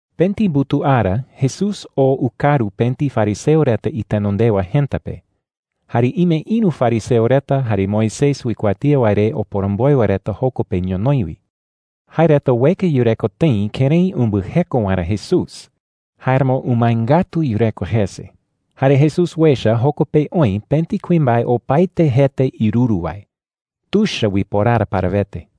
Pëti mbutuu ara Jesús oo ukaru pëti fariseo reta itenondewa jëta pe. Jare ime ïru fariseo reta jare Moisés uikuatía wae re oporomboe wae reta joko pe ñonoï wi. Jae reta ueka yureko tëi kërái umbɨjeko waerä Jesús. Jáeramo umae ngatu yureko jese. Jare Jesús uecha joko pe oï pëti kuimbae opaete jete iruru wae. Tuicha uiporara parawete.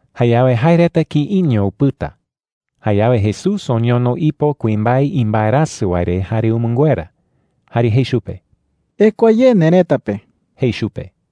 Jayawe jae reta kïiño upɨta. Jayawe Jesús oñono ipo kuimbae imbaerasɨ wae re jare umɨnguera. Jare jei chupe: “Ekua ye nerëta pe,” jei chupe.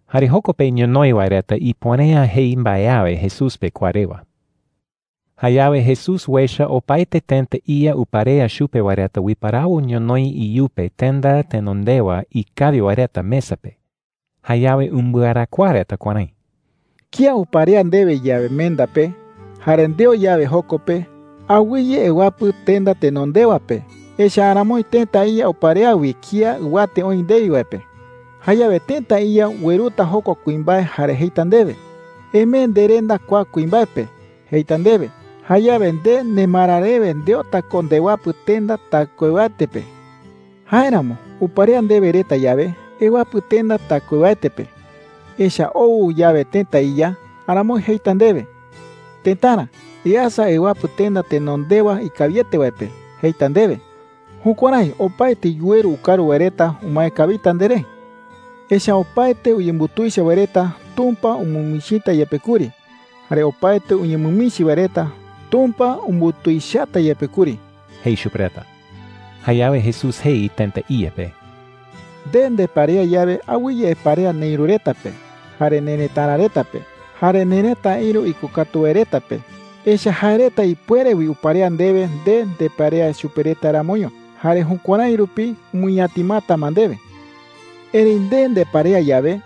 Jare joko pe ñonoï wae reta ipuere’ä jei mbae awe Jesús pe kua rewa. Jayawe Jesús uecha opaete tëta iya uparea chupe wae reta uiparawo ñonoï iyupe tenda tenondewa ikawi wae reta mesa pe. Jayawe umbɨarakuaa reta kuärái: “Kía uparea ndewe yawe menda pe, jare ndeo yawe joko pe, awɨye ewapɨ tenda tenondewa pe. Echa’ä aramoi tëta iya uparea wi kía ɨwate oï ndewi wae pe,” jei. “Jayawe tëta iya ueruta jokua kuimbae jare jeita ndewe: ‘Emee nderenda kua kuimbae pe,’ jeita ndewe. Jayawe nde nemara rewe ndeota ko ndewapɨ tenda taɨkuewaete pe,” jei Jesús chupe reta. “Jáeramo uparea ndewe reta yawe, ewapɨ tenda taɨkuewaete pe. Echa’ä ou yawe tëta iya, aramoi jeita ndewe: ‘Tëtara, easa ewapɨ tenda tenondewa ikawiete wae pe,’ jeita ndewe. Jukuärái opaete yuweru ukaru wae reta umae kawita nderé,” jei. “Echa’ä opaete uyembutuicha wae reta, Tumpa umɨmichita yepe kuri. Jare opaete uñemɨmichi wae reta, Tumpa umbutuichata yepe kuri,” jei chupe reta. Jayawe Jesús jei tëta iya pe: “Nde ndeparea yawe, awɨye eparea neïru reta pe, jare nerëtara reta pe, jare nerëta ïru ikokatu wae reta pe. Echa’ä jae reta ipuere wi uparea ndewe nde ndeparea chupe reta ramoño, jare jukuärái rupi umɨñatimata ma ndewe,” jei chupe. “Erëi nde ndeparea yawe,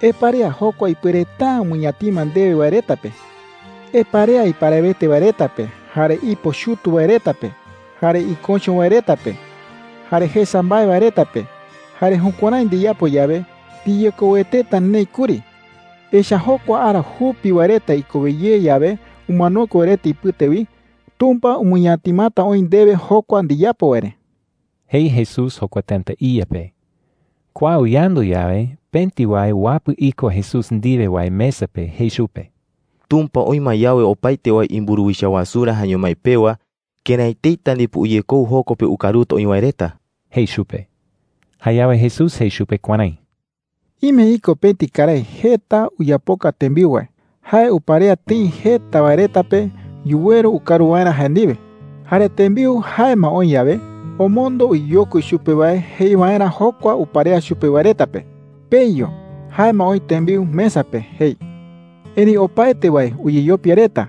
eparea jokua ipuereta’ä umɨñatima ndewe wae reta pe,” jei. “Eparea iparawete wae reta pe, jare ipo chutu wae reta pe, jare iköcho wae reta pe, jare jesa mbae wae reta pe. Jare jukuärái ndiyapo yawe, ndiyekoueteta neï kuri. Echa’ä jokua ara jupi wae reta ikowe ye yawe umanokue wae reta ipɨte wi, Tumpa umɨñatimata oï ndewe jokua ndiyapo wae re,” jei Jesús jokua tëta iya pe. Kua uyandu yawe, pëti wae uwapɨ iko Jesús ndiwe wae mesa pe jei chupe: “Tumpa oï ma yawe opaete wae imburuwicha wasurä jaeño mái pewa, ¡kërái eteita ndipo uyekou joko pe ukaruta oï wae reta!” jei chupe. Jayawe Jesús jei chupe kuärái: “Ime iko pëti karái jeta uyapoka tembiu wae. Jae uparea tëi jeta wae reta pe yuweru ukaru waerä jae ndiwe. Jare tembiu jae ma oï yawe, omondo uyeyokui chupe wae jei waerä jokua uparea chupe reta wae pe: ‘Peyu. Jae ma oï tembiu mesa pe,’ jei. “Erëi opaete wae uyeyopia reta.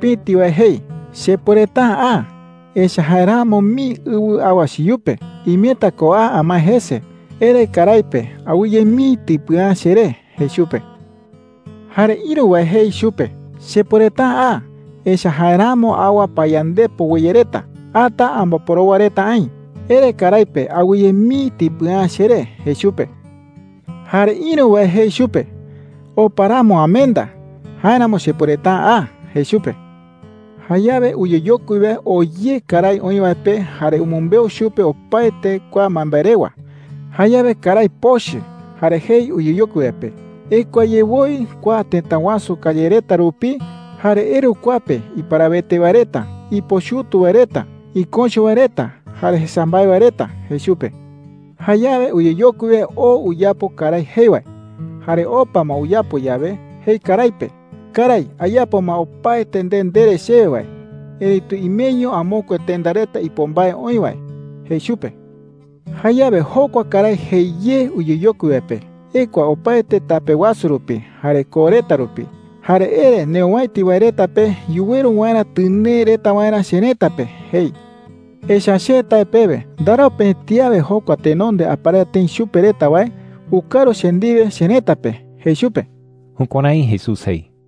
Pëti wae jei: ‘Chepuereta’ä a. Echa’ä jaeramo mii ɨwɨ awa cheyupe. Imeta ko a amae jese. Ere karái pe awɨye mii tipɨa’ä cheré,’ jei chupe. “Jare ïru wae jei chupe: ‘Chepuereta’ä a. Echa’ä jaeramo awa payandepo weye reta. Ata amboporowa reta aï. Ere karái pe awɨye mii tipɨa’ä cheré,’ jei chupe. “Jare ïru wae jei chupe: ‘Opa ramo amenda. Jáeramo chepuereta’ä a,’ jei chupe. “Jayawe uyeyokui wae oo ye karái oï wae pe jare umɨmbeu chupe opaete kua mbaembae rewa. Jayawe karái pochɨ jare jei uyeyokui wae pe: ‘Ekua ye woi kua tëta wasu calle reta rupi jare eru kua pe iparawete wae reta, ipo chutu wae reta, iköcho wae reta, jare jesa mbae wae reta,’ jei chupe. “Jayawe uyeyokui wae oo uyapo karái jei wae. Jare opa ma uyapo yawe, jei karái pe: ‘Karái, ayapo ma opaete nde ndere chewe wae, erëitu imeño amokue tenda reta ipo mbae oï wae,’ jei chupe. “Jayawe jokua karái jei ye uyeyokui wae pe: ‘Ekua opaete tape wasu rupi jare koo reta rupi, jare ere neowäiti wae reta pe yuweru waerä tɨnee reta waerä cherëta pe,’ jei. ‘Echa’ä che tae pewe, ndarau pëti awe jokua tenonde aparea tëi chupe reta wae ukaru che ndiwe cherëta pe,’ jei chupe.” Jukuärái Jesús jei.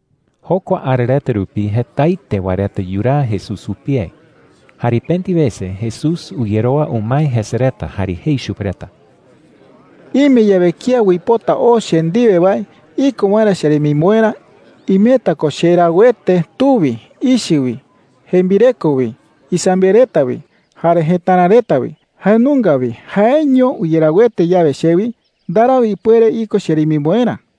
Jokua ara reta rupi jetaete wae reta yuraa Jesús jupie. Jare pëti wese Jesús uyerowa umae jese reta jare jei chupe reta: “Ime yawe kía uipota oo che ndiwe wae iko waerä cheremimboerä, imeta ko cherauete tu wi, ichɨ wi, jembireko wi, isambiaɨ reta wi, jare jëtara reta wi. Jae nunga wi jaeño uyerauete yawe chewi, ndarau ipuere iko cheremimboerä,” jei.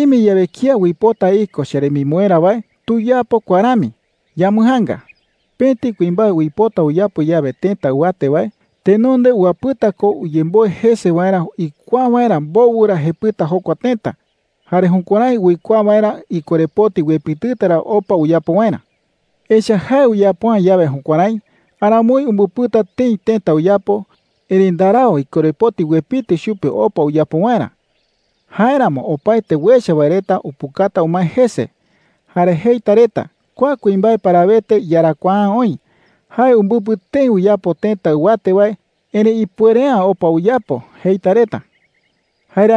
“Ime yawe kía uipota iko cheremimboerä wae, tuyapo kua rami – yambɨjaanga: Pëti kuimbae uipota uyapo yawe tëta ɨwate wae, tenonde uwapɨta ko uyemboe jese waerä uikuaa waerä mbowɨ ra jepɨta jokua tëta, jare jukuärái uikuaa waerä ikorepoti uepitɨta ra opa uyapo waerä,” jei. “Echa’ä jae uyapo’ä yawe jukuärái, aramoi umbɨpɨta tëi tëta uyapo, erëi ndarau ikorepoti uepitɨ chupe opa uyapo waerä. Jáeramo opaete uecha wae reta upukata umae jese. Jare jeita reta: ‘Kua kuimbae parawete iyarakuaa’ä oï. Jae umbɨpɨ tëi uyapo tëta ɨwate wae, erëi ipuere’ä opa uyapo,’ jeita reta,” jei.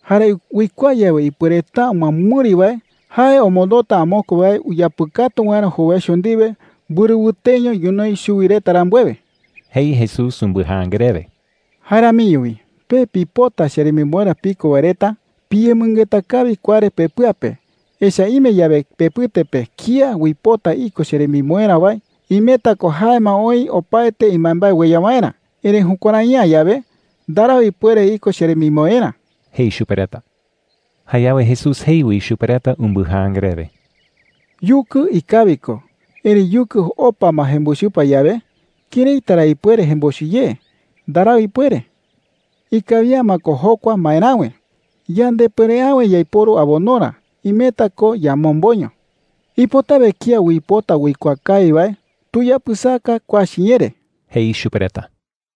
“Jare uikuaa yawe ipuereta’ä umɨamɨri wae, jae omondota amokue wae uyapɨkatu waerä jowaicho ndiwe mbɨrɨ wɨteño ñonoï chuwi reta rambuewe,” jei Jesús umbɨjaanga rewe. “Jae ramiño wi pe pipota cheremimboerä piko wae reta, piyemɨngeta kawi kua re pepɨa pe. Echa’ä ime yawe pepɨte pe kía uipota iko cheremimboerä wae, imeta ko jae ma oï opaete imbaembae ueya waerä. Erëi jukuärai’ä yawe, ndarau ipuere iko cheremimboerä,” jei chupe reta. Jayawe Jesús jei wi chupe reta umbɨjaanga rewe: “Yukɨ ikawi ko. Erëi yukɨ opa ma jembochɨpa yawe, ¿këraita ra ipuere jembochɨ ye? Ndarau ipuere. Ikawi’ä ma ko jokua maeräwe. Yandepuere’äwe yaiporu abonorä. Imeta ko yamomboño,” jei. “Ipotawe kía uipota uikuaa kawi wae, tuyapɨsaka kua chiñee re,” jei chupe reta.